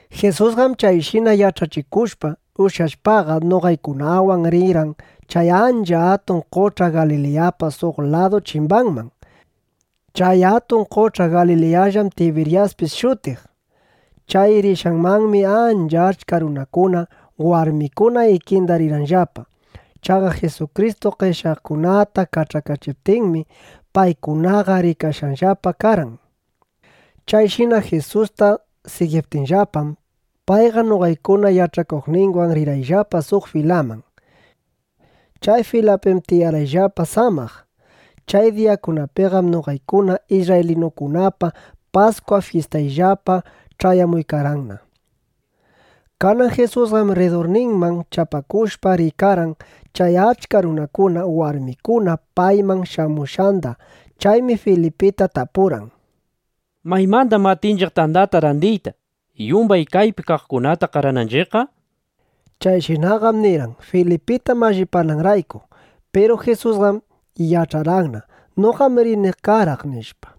Jisusqam chayshina yach'achikushpa, ushyashpaqa, noqaykunawan rirqan chay ancha atun qoch'a Galiliyapa suq ladu chimbanman. Chay atun qoch'a Galiliyallam Tibiryaspis shutiq. Chay rishqanmanmi ancha achka runakuna, warmikuna ikinda rirqanllapa. Chaqa Jisukristu qeshyaqkunata kach'akachiptinmi, paykunaqa rikashqallapa karqan. Chayshina Jisusta sigiptinllapam, payqa noqaykuna yach'akuqninwan rirqayllapa suq filaman. Chay filapim tiyarqayllapa samaq. Chay diyakunapiqam noqaykuna isrraylinukunapa Paskwa fyistayllapa ch'ayamuykarqanna. Kanan Jisusqam rridurninman chapakushpa, rikarqan chay achka runakuna, warmikuna payman shamushqanda. Chaymi Filipita tapurqan: —¿Maymandam atinchiq tandata randiyta, yumbay kaypi kaqkunata qarananchiqqa? nishpa. Chayshinaqam nirqan, Filipita mallipananrayku. Piru Jisusqam yach'arqanna: Noqam rini qaraq, nishpa.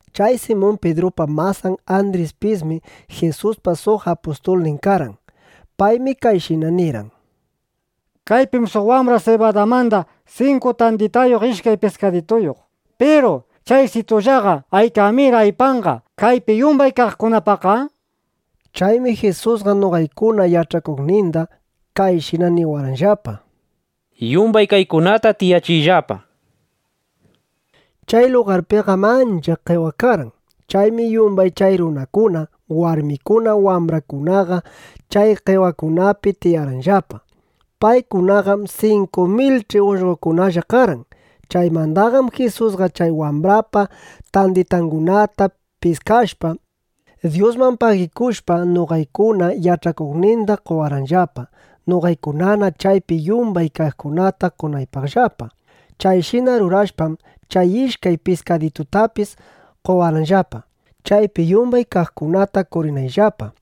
Chay Simun Pidrupa masan Andrispismi Jisuspa suq apustulnin karqan. Paymi kayshina nirqan: —Kaypim suq wambra sibadamanda sinku tanditayuq, ishkay piskadituyuq. Piru ¿chaysitullaqa aykamir aypanqa kaypi yumbay kaqkunapaqqa? nishpa. Chaymi Jisusqa noqaykuna yach'akuqninda kayshina niwarqanllapa: —Yumbay kaykunata tiyachiyllapa, nishpa. Chay lugarpiqam ancha qewa karqan. Chaymi yumbay chay runakuna, warmikuna, wambrakunaqa chay qewakunapi tiyarqanllapa. Paykunaqam 5.000ch'i ullqokunalla karqan. Chaymandaqam Jisusqa chay wambrapa tanditangunata piskashpa, Dyusman pagikushpa, noqaykuna yach'akuqninda qowarqanllapa, noqaykunana chaypi yumbay kaqkunata qonaypaqllapa. Chayshina rurashpam, chay ishkay piskaditutapis qowarqanllapa, chaypi yumbay kaqkunata qorinayllapa.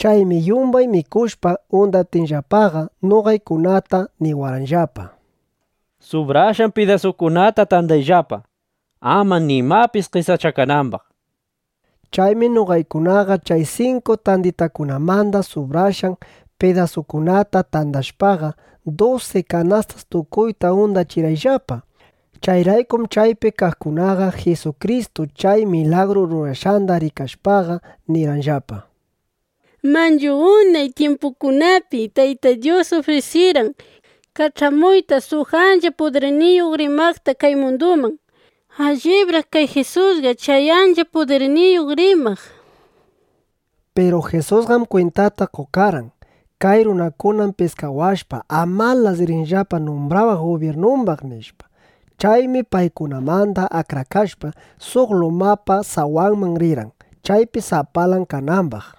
Chaymi yumbay mikushpa undaptinllapaqa, noqaykunata niwarqanllapa: —Subrashqan pidasukunata tandayllapa, ama nimapis qesachakanambaq, nishpa. Chaymi noqaykunaqa chay sinku tanditakunamanda subrashqan pidasukunata tandashpaqa, dusi kanastas tukuyta undachirqayllapa. Chayraykum chaypi kaqkunaqa Jisukristu chay milagru rurashqanda rikashpaqa, nirqanllapa: —Manchu unay tyimpukunapi Tayta Dyus ufrisirqan kach'amuyta suq ancha pudirniyuq rimaqta kay munduman. Allibraq kay Jisusqa chay ancha pudirniyuq rimaq, nishpa. Piru Jisusqam kwintata qokarqan: Kay runakunam piskawashpa, amalas rinllapa numbrawaq gubyirnumbaq, nishpa. Chaymi paykunamanda akrakashpa, suq lumapa sawanman rirqan, chaypi sapalan kanambaq.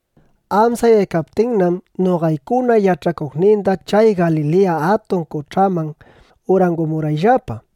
Amsayaykaptinnam noqaykuna yach'akuqninqa chay Galiliya Atun Qoch'aman urangumurqayllapa.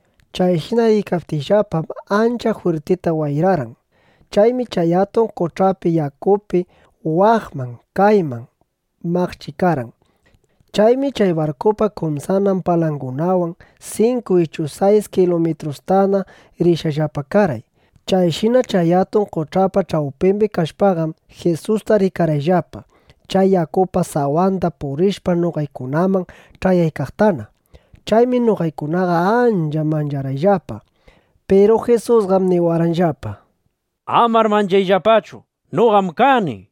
Chayshina riykaptiyllapam, ancha jwirtita wayrarqan. Chaymi chay atun qoch'api yakuqa waqman, kayman maqchikarqan. Chaymi chay barkupa kumsanan palangunawan sinku ichu sayis kilumitrustana rishqallapa karqay. Chayshina chay atun qoch'apa ch'awpimbi kashpaqam, Jisusta rikarqayllapa, chay yakupa sawanda purishpa, noqaykunaman ch'ayaykaqtana. Chaymi noqaykunaqa ancha mancharqayllapa. Piru Jisusqam niwarqanllapa: —¡Amar manchayllapachu; noqam kani! nishpa.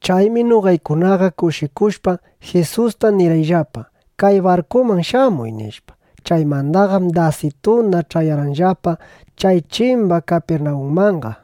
Chaymi noqaykunaqa kushikushpa, Jisusta nirqayllapa: —Kay barkuman shamuy, nishpa. Chaymandaqam dasituna ch'ayarqayllapa chay chimba Kapirnawunmanqa.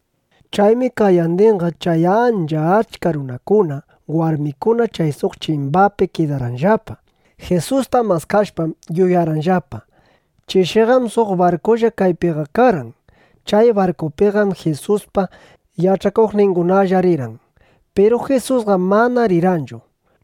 Chaymi qayandinqa chay ancha achka runakuna, warmikuna chay suq chimbapi kidarqanllapa. Jisusta maskashpam, yuyarqanllapa: Chishiqam suq barkulla kaypiqa karqan. Chay barkupiqam Jisuspa yach'akuqningunalla rirqan. Piru Jisusqam mana rirqanchu, nishpa.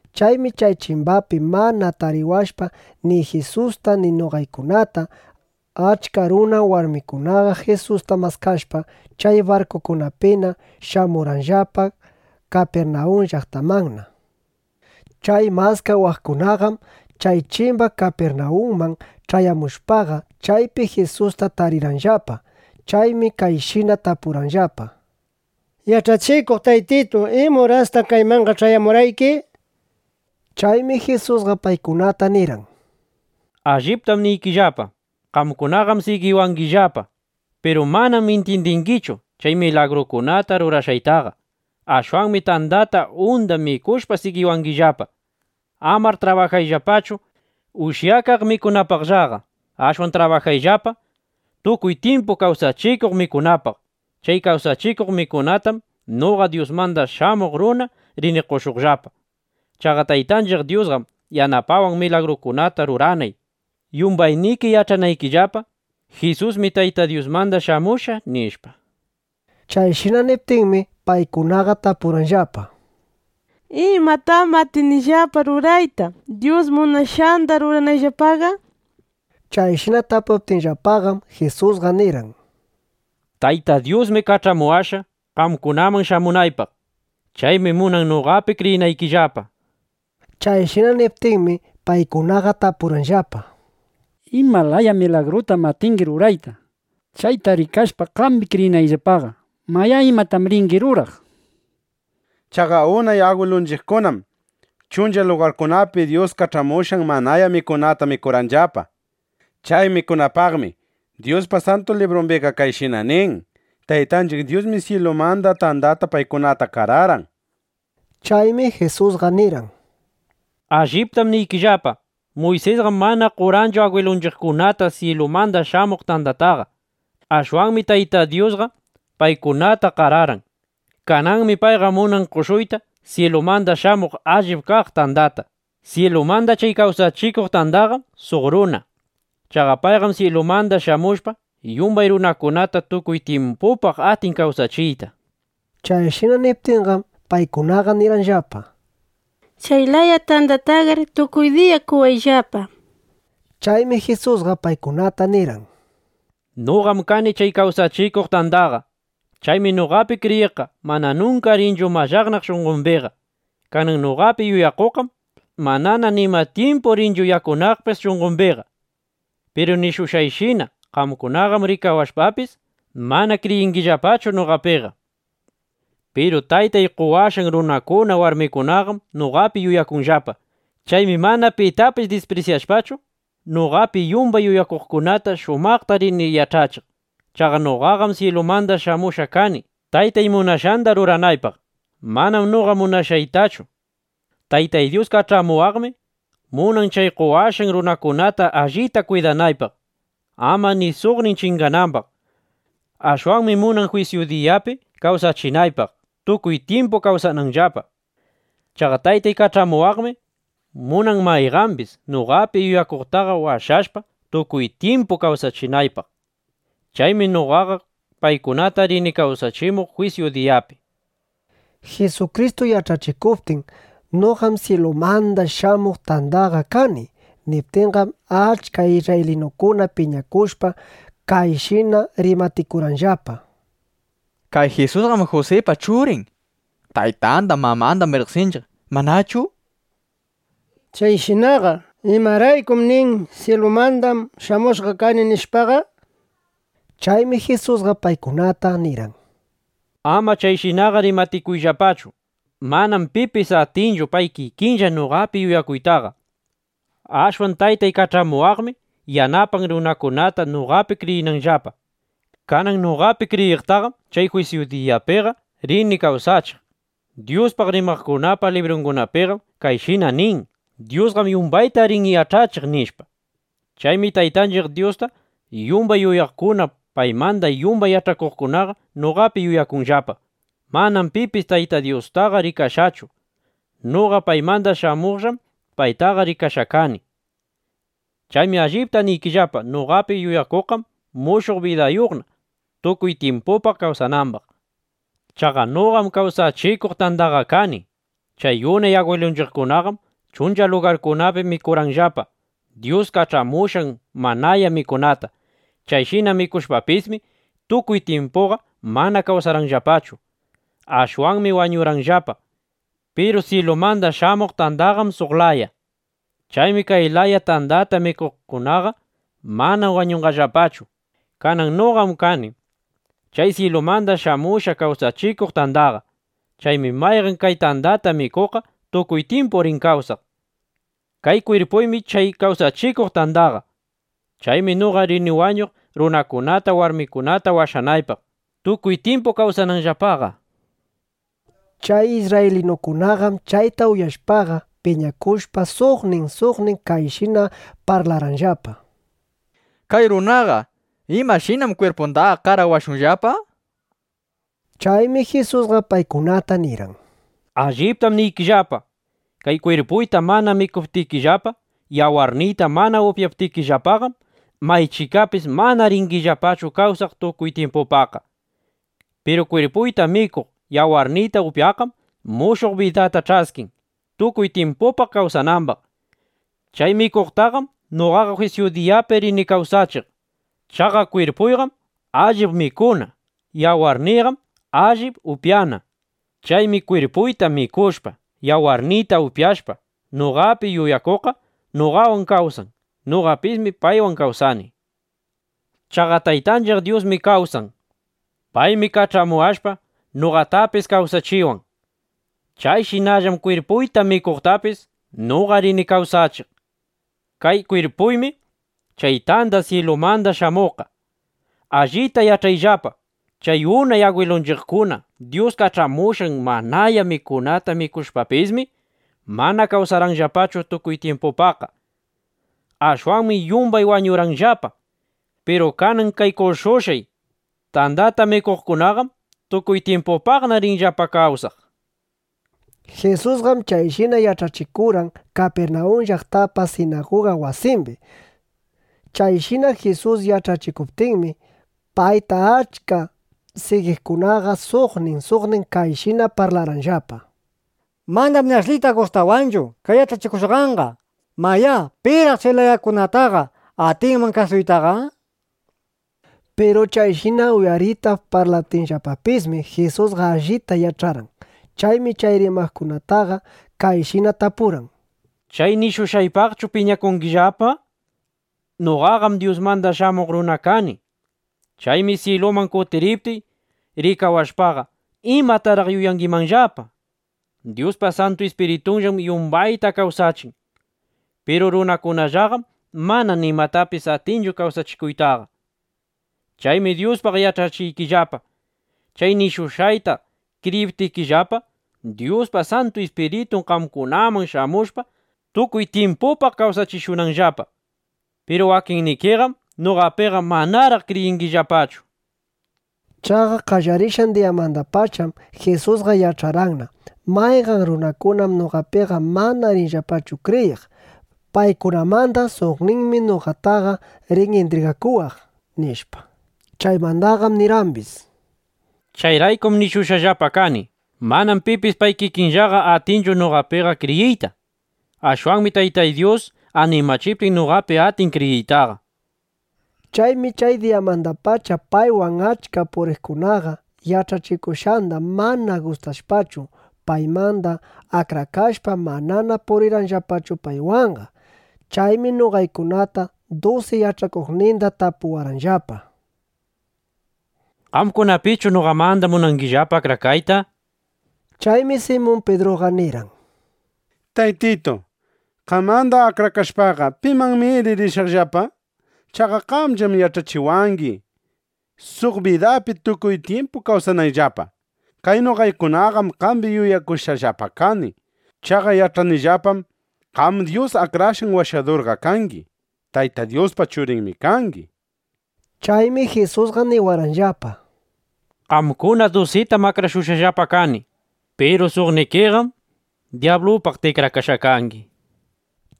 Chaymi chay chimbapi mana tariwashpa ni Jisusta ni noqaykunata, achka runa, warmikunaqa Jisusta maskashpa, chay barkukunapina shamurqanllapa Kapirnawun llaqtamanna. Chay maskawaqkunaqam chay chimba Kapirnawunman ch'ayamushpaqa, chaypi Jisusta tarirqanllapa. Chaymi kayshina tapurqanllapa: —Yach'achikuq Taytitu, ¿ima urastaq kaymanqa ch'ayamurqayki? nishpa. Chaymi Jisusqa paykunata nirqan: —Alliptam niykillapa, qamkunaqam sigiwangillapa; piru manam intyindingichu chay milagrukuna rurashqaytaqa. Ashwanmi tandata unda mikushpa sigiwangillapa. Amar trabajayllapachu ushyakaq mikunapaqllaqa. Ashwan trabajayllapaqa tukuy tyimpu kawsachikuq mikunapaq. Chay kawsachikuq mikunatam noqa Dyusmanda Shamuq Runaqa rini qoshuqllapa. Chaqa Taytanchiq Dyusqam yanapawan, milagrukunata ruranay, yumbayniki yach'anaykillapa: Jisusmi Tayta Dyusmanda shamushqa, nishpa. Chayshina niptinmi, paykunaqa tapurqanllapa: —¿Imatam atinillapa rurayta, Dyus munashqanda ruranayllapaqa? nishpa. Chayshina tapuptinllapaqam, Jisusqa nirqan: —Tayta Dyusmi kach'amuwashqa, qamkunaman shamunaypaq. Chaymi munan noqapi kriyinaykillapa, nishpa. Chayshina niptinmi, paykunaqa tapurqanllapa: —¿Ima laya milagrutam atingi rurayta, chayta rikashpa, qambi kriyinayllapaqa? ¿Mayá, imatam ringi ruraq? Chaqa unay agwilunchiqkunam chuncha lugarkunapi Dyus kach'amushqan manaya mikunata mikurqanllapa. Chay mikunapaqmi Dyuspa Santu Librumbiqa kayshina nin: “Taytanchiq Dyusmi syilumanda tandata paykunata qararqan”, nishpa. Chaymi Jisusqa nirqan: —Alliptam niykillapa, Muysisqam mana qorqanchu agwilunchiqkunata syilumanda shamuq tandataqa. Ashwanmi Taytay Dyusqa paykunata qararqan. Kananmi payqa munan qoshuyta syilumanda shamuq allip kaq tandata. Syilumanda chay kawsachikuq tandaqam suq runa. Chaqa payqam syilumanda shamushpa, yumbay runakunata tukuy tyimpupaq atin kawsachiyta, nishpa. Chayshina niptinqam, paykunaqa nirqanllapa: —Chay laya tandataqar tukuy diya qowayllapa, nishpa. Chaymi Jisusqa paykunata nirqan: —Noqam kani chay kawsachikuq tandaqa. Chaymi noqapi kriyiqqa mana nunka rinchu mallaqnaq shunqombiqa. Kanan noqapi yuyakuqqam manana nima tyimpu rinchu yakunaqpis shunqombiqa. Piru nishushqayshina, qamkunaqam rikawashpapis, mana kriyingillapachu noqapiqa. Piru Taytay qowashqan runakuna, warmikunaqam noqapi yuyakunllapa. Chaymi mana pitapis disprisyashpachu, noqapi yumbay yuyakuqkunata shumaqta rini ch'ayachiq. Chaqa noqaqam syilumanda shamushqa kani, Taytay munashqanda ruranaypaq; manam noqa munashqaytachu. Tayta Dyus kach'amuwaqmi munan chay qowashqan runakunata allita kwidanaypaq, ama ni suqnin chinganambaq. Ashwanmi munan jwisyu diyapi kawsachinaypaq, tukuy tyimpu kawsananllapa. Chaqa Taytay kach'amuwaqmi munan mayqambis noqapi yuyakuqtaqa washashpa, tukuy tyimpu kawsachinaypaq. Chaymi noqaqa paykunata rini kawsachimuq jwisyu diyapi, nishpa. Jisukristu yach'achikuptin: “Noqam syilumanda shamuq tandaqa kani” niptinqam, achka isrraylinukuna piñakushpa, kayshina rimatikurqanllapa: —Kay Jisusqam Jusipa churin. Taytanda mamandaqam riqsinchiq, ¿manachu? Chayshinaqa ¿imaraykum nin: “Syilumandam shamushqa kani”, nishpaqa? Chaymi Jisusqa paykunata nirqan: —Ama chayshinaqa rimatikuyllapachu. Manam pipis atinchu pay kikinlla noqapi yuyakuytaqa. Ashwan Taytay kach'amuwaqmi yanapan runakunata, noqapi kriyinanllapa. Kanan noqapi kriyiqtaqam chay jwisyu diyapiqa rini kawsachiq. Dyuspaq rimaqkunapa librungunapiqam kayshina nin: “Dyusqam yumbayta rin yach'achiq”, nishpa. Chaymi Taytanchiq Dyusta yumbay uyaqkuna, paymanda yumbay yach'akuqkunaqa noqapi yuyakunllapa. ’Manam pipis Tayta Dyustaqa rikashqachu. Noqa paymanda shamuqllam paytaqa rikashqa kani. Chaymi allipta niykillapa, noqapi yuyakuqqam mushuq bidayuqna, tukuy tyimpupaq kawsanambaq. Chaqa noqam kawsachikuq tandaqa kani. Chay unay agwilunchiqkunaqam chuncha lugarkunapi mikurqanllapa Dyus kach'amushqan manaya mikunata. Chayshina mikushpapismi, tukuy tyimpuqa mana kawsarqanllapachu. Ashwanmi wañurqanllapa. Piru syilumanda shamuq tandaqam suq laya. Chaymi kay laya tandata mikuqkunaqa mana wañunqallapachu. Kanan noqam kani chay syilumanda shamushqa kawsachikuq tandaqa. Chaymi mayqan kay tandata mikuqqa tukuy tyimpu rin kawsaq. Kay kwirpuymi chay kawsachikuq tandaqa. Chaymi noqa rini wañuq, runakunata, warmikunata washanaypaq, tukuy tyimpu kawsananllapaqa, nishpa. Chay isrraylinukunaqam chayta uyashpaqa, piñakushpa, suqnin suqnin kayshina parlarqanllapa: —Kay runaqa ¿imashinam kwirpundaqa qarawashunllapa? nishpa. Chaymi Jisusqa paykunata nirqan: —Alliptam niykillapa, kay kwirpuyta mana mikuptikillapa, yawarniyta mana upyaptikillapaqam, maychikapis mana ringillapachu kawsaq tukuy tyimpupaqqa. Piru kwirpuyta mikuq, yawarniyta upyaqqam mushuq bidata ch'askin, tukuy tyimpupaq kawsanambaq. Chay mikuqtaqam noqaqa jwisyu diyapi rini kawsachiq. Chaqa kwirpuyqam allip mikuna; yawarniyqam allip upyana. Chaymi kwirpuyta mikushpa, yawarniyta upyashpa noqapi yuyakuqqa noqawan kawsan. Noqapismi paywan kawsani. Chaqa Taytanchiq Dyusmi kawsan. Paymi kach'amuwashpa, noqatapis kawsachiwan. Chayshinallam kwirpuyta mikuqtapis noqa rini kawsachiq. Kay kwirpuymi chay tanda syilumanda shamuqqa. Allita yach'ayllapa: Chay unay agwilunchiqkuna Dyus kach'amushqan manaya mikunata mikushpapismi, mana kawsarqanllapachu tukuy tyimpupaqqa. Ashwanmi yumbay wañurqanllapa. Piru kanan kay qoshushqay tandata mikuqkunaqam tukuy tyimpupaqna rinllapa kawsaq, nishpa. Jisusqam chayshina yach'achikurqan Kapirnawun llaqtapa sinaguga wasimbi. Chayshina Jisus yach'achikuptinmi, payta achka sigiqkunaqa suqnin suqnin kayshina parlarqanllapa: —Manam ni ashlita gustawanchu kay yach'achikushqanqa. Mayá, ¿piraq chay layakunataqa atinman kasuytaqa? nishpa. Piru chayshina uyaritap parlaptinllapapismi, Jisusqa allita yach'arqan. Chaymi chay rimaqkunataqa kayshina tapurqan: —¿Chay nishushqaypaqchu piñakungillapa? Noqaqam Dyusmanda Shamuq Runa kani. Chaymi syiluman kutiriptiy, rikawashpaqa, ¿imataraq yuyangimanllapa? Dyuspa Santu Ispiritunllam yumbanda kawsachin. Piru runakunallaqam mana nimatapis atinchu kawsachikuytaqa. Chaymi Dyuspaq yach'achiykillapa, chay nishushqayta kriyiptikillapa, Dyuspa Santu Ispiritun qamkunaman shamushpa, tukuy tyimpupaq kawsachishunanllapa. Piru wakinnikiqam noqapiqa manaraq kriyingillapachu, nishpa. Chaqa qallarishqan diyamandapacham Jisusqa yach'arqanna: Mayqan runakunam noqapiqa mana rinllapachu kriyiq. Paykunamanda suqninmi noqataqa rin intrigakuwaq, nishpa. Chaymandaqam nirqambis: —Chayraykum nishushqallapa kani: “Manam pipis pay kikinllaqa atinchu noqapiqa kriyiyta. Ashwanmi Taytay Dyus animachiptin, noqapi atin kriyiytaqa”, nishpa. Chaymi chay diyamandapacha paywan achka puriqkunaqa, yach'achikushqanda mana gustashpachu, paymanda akrakashpa, manana purirqanllapachu paywanqa. Chaymi noqaykunata dusi yach'akuqninda tapuwarqanllapa: —¿Qamkunapischu noqamanda munangillapa akrakayta? nishpa. Chaymi Simun Pidruqa nirqan: —Taytitu, qamanda akrakashpaqa, ¿pimannamiri rishaqllapa? Chaqa qamllam yach'achiwangi, suq bidapi tukuy tyimpu kawsanayllapa. Kay noqaykunaqam qambi yuyakushqallapa kani. Chaqa yach'anillapam: Qam Dyus Akrashqan Washadurqa kangi. Tayta Dyuspa Churinmi kangi, nishpa. Chaymi Jisusqa niwarqanllapa: —Qamkuna dusitam akrashushqallapa kani. Piru suqnikiqam dyablupaq tikrakashqa kangi, nishpa.